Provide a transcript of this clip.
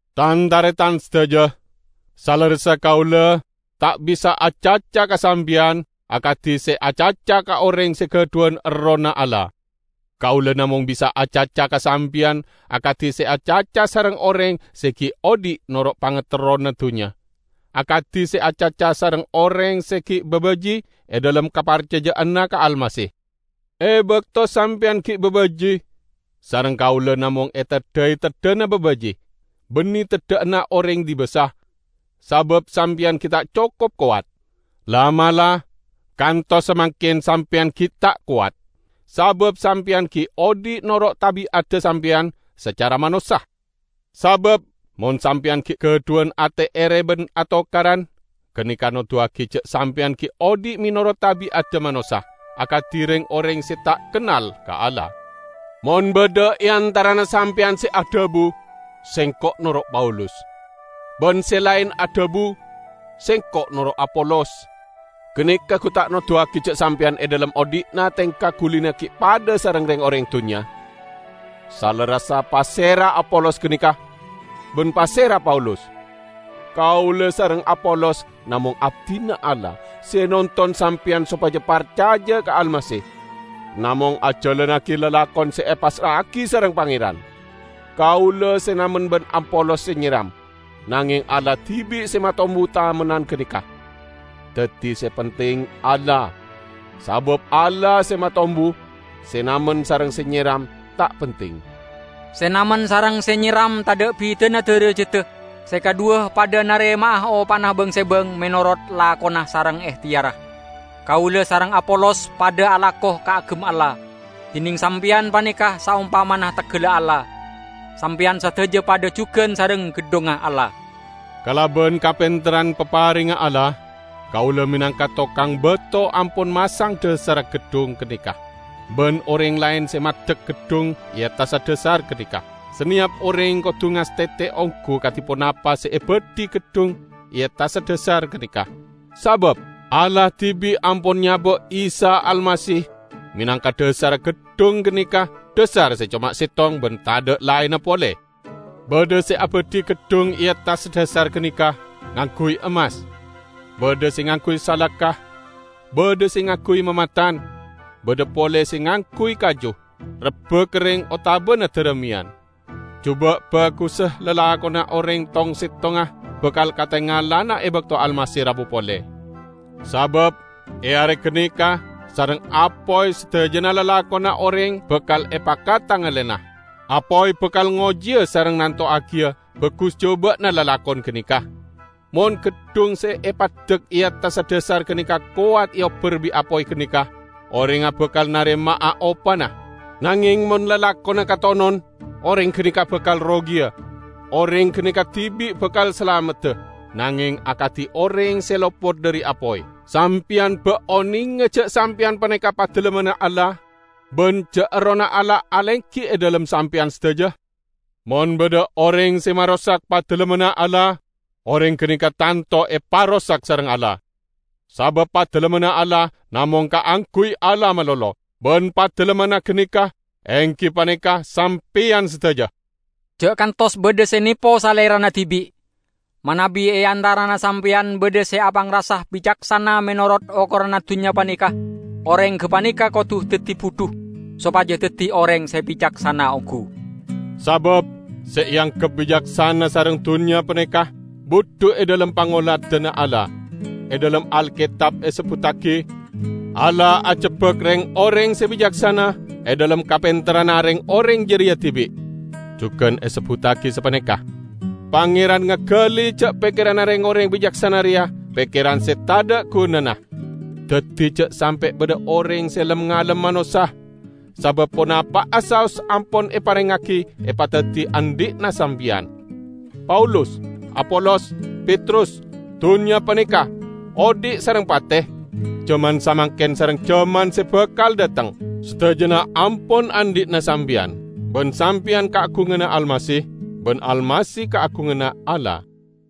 Tan-taretan sadaja! Salerressa kaula ta' bisa acaca ka sampeyan akadi se acaca ka oreng se gadhuwan Errohna Allah. Kaula namong bisa acaca ka sampeyan akadi se acaca sareng oreng se gi' odhi' noro' pangaterrona dunnya; akadi se acaca sareng oreng se gi' babaji' e dhalem kaparcaja'anna ka Almasih. E bakto sampeyan gi' babaji' sareng kaula namong eteddhai teddhana babaji', banne teddha'anna oreng dibasa; sabab sampeyan gi' ta' cokop kowat. La'-mala' kantos samangken sampeyan gi' ta' kowat, sabab sampeyan gi' odhi' noro' tabi'adda sampeyan sacara manossa. Sabab mon sampeyan gi' gadhuwan ate ere ban atokaran, ganeka noduwagi ja' sampeyan gi' odhi' menorot tabi'adda manossa, akadi reng-oreng se ta' kennal ka Allah. Mon badha e antarana sampeyan se adhabu, "Sengko' noro' Paulus," ban se laen adhabu, "Sengko' noro' Apolos," ganeka gu ta' noduwagi ja' sampeyan e dhalem odhi'na tengka gulina gi' padha sareng reng-oreng dunnya? Salerressa, pasera Apolos ganeka? Ban pasera Paulus? Kaula sareng Apolos namong abdina Allah, se nonton sampeyan sopaja parcaja ka Almasih, namong ajalannagi lalakon se epassra'agi sareng Pangeran. Kaula se namen ban Apolos se nyeram, nangeng Allah dibi' se matombu tamennan ganeka. Daddi se penting Allah, sabab Allah se matombu; se namen sareng se nyeram ta' penting. Se namen sareng se nyeram tadha' bidana darajadda; se kadhuwa padha narema'a opana bang-sebang menorot lakona sareng ehteyarra. Kaula sareng Apolos padha alako kaagem Allah, dineng sampeyan paneka saompamana teggalla Allah. Sampeyan sadaja padha jugan sareng geddhongnga Allah. Kalaban kapenterran paparengnga Allah, kaula menangka tokang bato ampon masang dhasarra geddhong ganeka, ban oreng laen se maddek geddhong e attassa dhasar ganeka. Saneyap oreng kodu ngastete onggu kadi ponapa se abadhi geddhong e attassa dhasar ganeka. Sabab Allah dibi' ampon nyaba' Isa Almasih menangka dhasarra geddhong ganeka, dhasar se coma settong ban tadha' laenna pole. Badha se abadhi geddhong e attassa dhasar ganeka ngangguy emmas, badha se ngangguy salaka, badha se ngangguy mamatan, badha pole se ngangguy kaju, rebba kerreng otabana darameyan. Juba' bagussa lalakonna oreng tong-settongnga bakal katengalana e bakto Almasih rabu pole. Sabab e are ganeka sareng apoy sadajana lalakonna oreng bakal epakatengalana; apoy bakal ngojiya sareng nantowagiya bagus juba'na lalakon ganeka. Mon geddhong se epaddek e attassa dhasar ganeka kowat eobbar bi' apoy ganeka, orengnga bakal narema'a opana. Nangeng mon lalakonna katonon, oreng ganeka bakal rogiya; oreng ganeka dibi' bakal salamedda, nangeng akadi oreng se lopot dhari apoy. Sampeyan ba' onenga ja' sampeyan paneka Padalemmanna Allah? Ban ja' Errohna Allah alenggi e dhalem sampeyan sadaja? Mon badha oreng se marosak Padalemmanna Allah, oreng ganeka tanto eparosak sareng Allah. Sabab Padalemmanna Allah namong kaangguy Allah malolo, ban Padalemmanna ganeka enggi paneka sampeyan sadaja. Ja' kantos badha se nepo salerana dibi'. Manabi e antarana sampeyan badha se apangrasa bicaksana menorot okoranna dunnya paneka, oreng gapaneka kodu daddi budhu, sopaja daddi oreng se bicaksana onggu. Sabab se eanggep bicaksana sareng dunnya paneka budhu e dhalem pangoladanna Allah. E dhalem Alketab esebbuttagi, "Allah ajebbak reng-oreng se bicaksana e dhalem kapenterranna reng-oreng jareya dibi'." Jugan esebbuttagi sapaneka, "Pangeran ngagali ja' pekkeranna reng-oreng bicaksana reya pekkeran se tadha' gunana." Daddi ja' sampe' badha oreng se lem-ngalem manossa; sabab ponapa'a saos ampon eparengngagi epadaddi andhi'na sampeyan: Paulus, Apolos, Petrus, dunnya paneka, odhi' sareng pate, jaman samangken sareng jaman se bakal dhateng, sadajana ampon andhi'na sampeyan. Ban sampeyan kaagunganna Almasih, ban Almasih kaagunganna Allah.